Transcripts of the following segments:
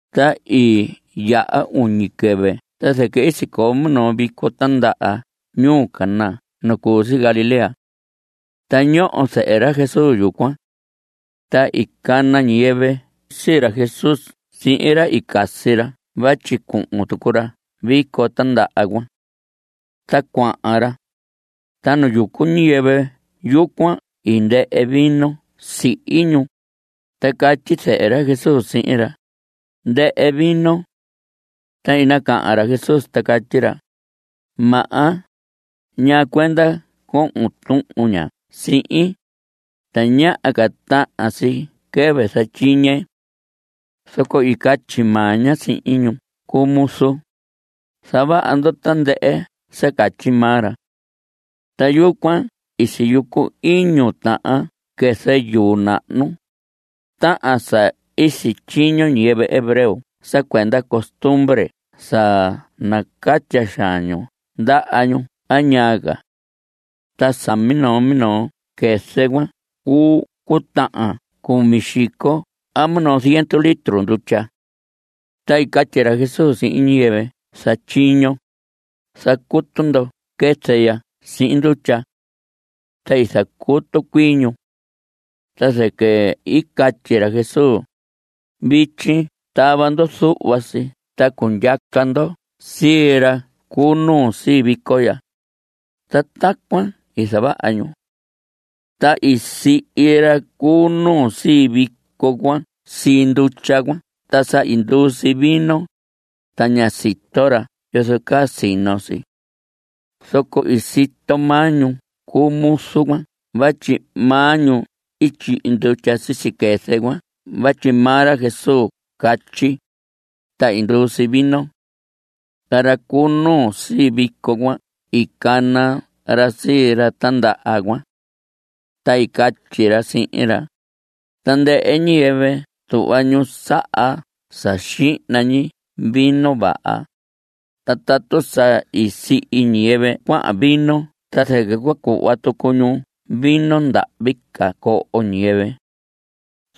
Ta i yaha uñi quɨvɨ ta zɨquɨ sicoo minoo vico tindaha ñuu Caná nu cu si Galilea. Ta ñoho zɨhɨ ra Jesús yucuan. Ta i cana ñiyɨvɨ sii ra Jesús sihin ra i casi ra vatyi cuhun tucu ra vico tindaha cuan. Ta cuahan ra, ta nu yucu ñiyɨvɨ yucuan i ndɨhɨ vino sihi ñu, ta catyi zɨhɨ ra Jesús sihin ra: Ndɨhɨ vino. Ta i nacahan ra Jesús ta catyi ra: Maha, ¿ñaa cuenda cohon tuhun ña sihin? Tañaha ca tahan si quɨvɨ zatyiñe. Zoco i catyi maa ña sihin ñu cu muzu: Zavaha ndo tandɨhɨ sa catyi maa ra. Ta yucuan siyucu iñu tahan quɨzɨ yuu nahnu, tahan sa sityiño ñiyɨvɨ hebreo sa cuenda costumbre sa nacatya xaan ñu ndaha ñu a ñaa ca. Ta sa minoo minoo quɨzɨ cuan cuu cutahan cumi xico a minoo ziendu litro ndutya. Ta i catyi ra Jesús sihin ñiyɨvɨ zatyiño: Zacutu ndo quɨzɨ ya sihin ndutya. Ta i zacutu cuii ñu. Ta zɨquɨ i catyi ra Jesús: Vityi tava ndo zuhva si ta cundyaca ndo sii ra cu nuu sii vico ya. Ta tacuan i zavaha ñu. Ta i sihi ra cu nuu sii vico cuan sii ndutya cuan ta sa i nduu si vino, ta ñá sito ra yozo caa sino si. Zoco i sito maa ñu cu muzu cuan vatyi maa ñu i tyihi ndutya sisi quɨzɨ cuan vatyi maa ra Jesús catyi, ta i nduu si vino. Ta ra cu nuu sii vico cuan i cana ra sii ra tindaha cuan. Ta i catyi ra sihin ra: Tandɨhɨ ñiyɨvɨ tuhva ñu saha sa xihna ñi vino vaha, ta tatu sa i sihi ñiyɨvɨ cuaha vino ta zɨquɨ cua cuhva tucu ñu vino ndahvi ca coho ñiyɨvɨ.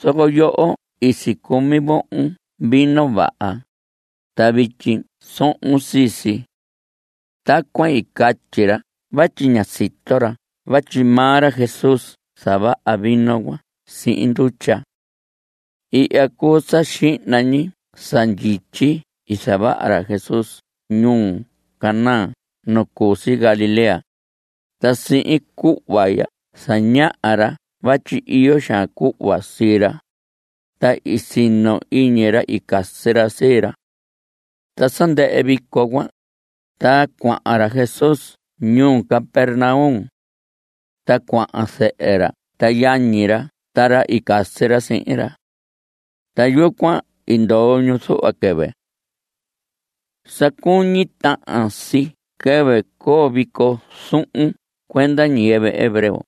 Zoco yoho i sicumi vohon vino vaha, ta vityi sohon sii si. (Tacuan i catyi ra vatyi ña sito ra vatyi maa ra Jesús zavaha vino cuan sihin ndutya.) Ihya cuu sa xihna ñi sa ndyityi i zavaha ra Jesús ñuu Caná nu cu si Galilea, ta sihin cuhva ya zañaha ra vatyi iyo xaan cuhva sii ra, ta i sino iñi ra i casi ra sii ra. Ta sa ndɨhɨ vico cuan, ta cuahan ra Jesús ñuu Capernaum. Ta cuahan zɨhɨ ra ta yañi ra ta ra i casi ra sihin ra. Ta yucuan i ndoo ñu zuhva quɨvɨ. Sa cuñi tahan si quɨvɨ coo vico zuhun cuenda ñiyɨvɨ hebreo,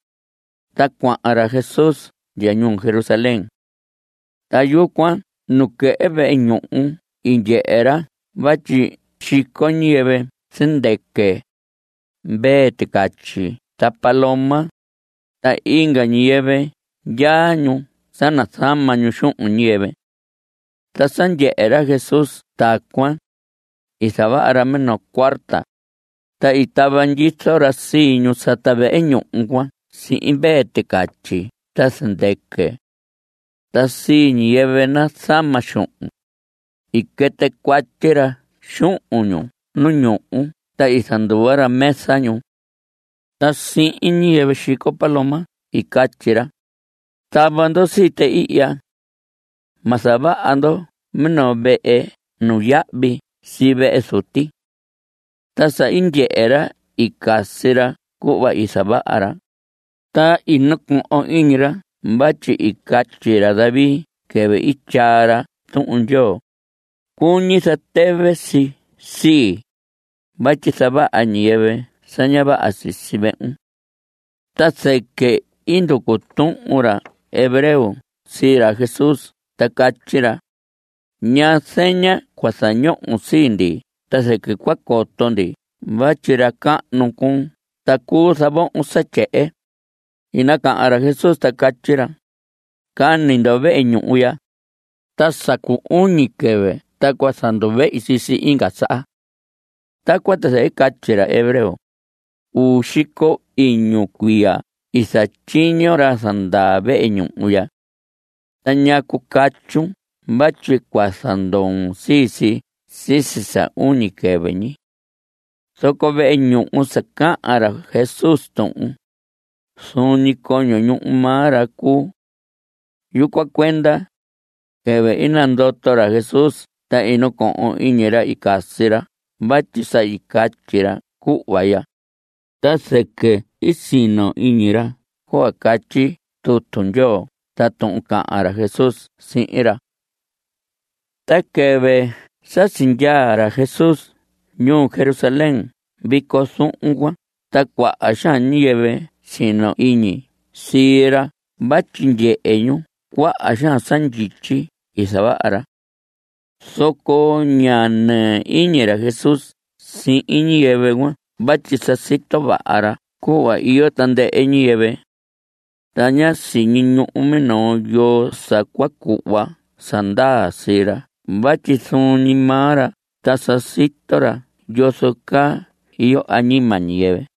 ta cuahan ra Jesús ndya ñuu Jerusalén. Ta yucuan nuquehe vehe ñuhu i ndyehe ra vatyi xico ñiyɨvɨ zɨndɨquɨ, mvee ticatyi ta paloma, ta inga ñiyɨvɨ ndyaa ñu sa nazama ñu xuhun ñiyɨvɨ. Ta sa ndyehe ra Jesús tacuan, i zavaha ra minoo cuarta, ta i tava ndyizo ra sii ñu sata vehe ñuhu cuan sihin mvee ticatyi ta zɨndɨquɨ. Ta sii ñiyɨvɨ nazama xuhun, i quɨtɨ cuatyi ra xuhun ñu nu ñuhu ta i zanduva ra mesa ñu. Ta sihin ñiyɨvɨ xico paloma i catyi ra: Tava ndo sii tɨ ihya. Ma zavaha ndo minoo vehe nuyahvi sii vehe Zuti. Ta sa i ndyehe ra i casi ra cuhva i zavaha ra, ta i nacohon iñi ra vatyi i catyi ra David quɨvɨ i tyaa ra Tuhun Ndyoo: “Cuñi zatɨvɨ si sii, vatyi zavaha ñiyɨvɨ sa ña vaha sisi vehun.” Ta zɨquɨ i nducu tuhun ra hebreo sii ra Jesús ta catyi ra: ¿Ñaa zeña cua zañohon sii ndi ta zɨquɨ cua coto ndi vatyi ra cahnu cuun ta cuu zavohon sa tyehen? I nacahan ra Jesús ta catyi ra: Cani ndo vehe ñuhu ya, ta sa cu uñi quɨvɨ ta cua zanduvehi sii si inga saha. Tacuan ta zɨquɨ i catyi ra hebreo: Uu xico iñu cuiya i zatyiño ra zandaa vehe ñuhu ya. ¿Ta ñacu catyun vatyi cua zandoon sii si sisi sa uñi quɨvɨ ñi? Zoco vehe ñuhu sa cahan ra Jesús tuhun, zuun ñi coño ñuhu maa ra cuu. Yucuan cuenda, quɨvɨ i nandoto ra Jesús ta i nacohon iñi ra i casi ra vatyi sa i catyi ra cuhva ya. Ta zɨquɨ i sino iñi ra cuhva catyi tutu Ndyoo ta tuhun cahan ra Jesús sihin ra. Ta quɨvɨ sa sindyaa ra Jesús ñuu Jerusalén vico zuhun cuan ta cuaha xaan ñiyɨvɨ sino iñi sii ra vatyi ndyehe ñu cuaha xaan sa ndyityi i zavaha ra. Zoco ña nɨɨ iñi ra Jesús sihin ñiyɨvɨ cuan vatyi sa sito vaha ra cuhva iyo tandɨhɨ ñiyɨvɨ. Ta ña siñi ñuhu minoo, yoo sa cua cuhva sa ndaa sii ra vatyi zuun ñi maa ra ta sa sito ra yozo caa iyo añima ñiyɨvɨ.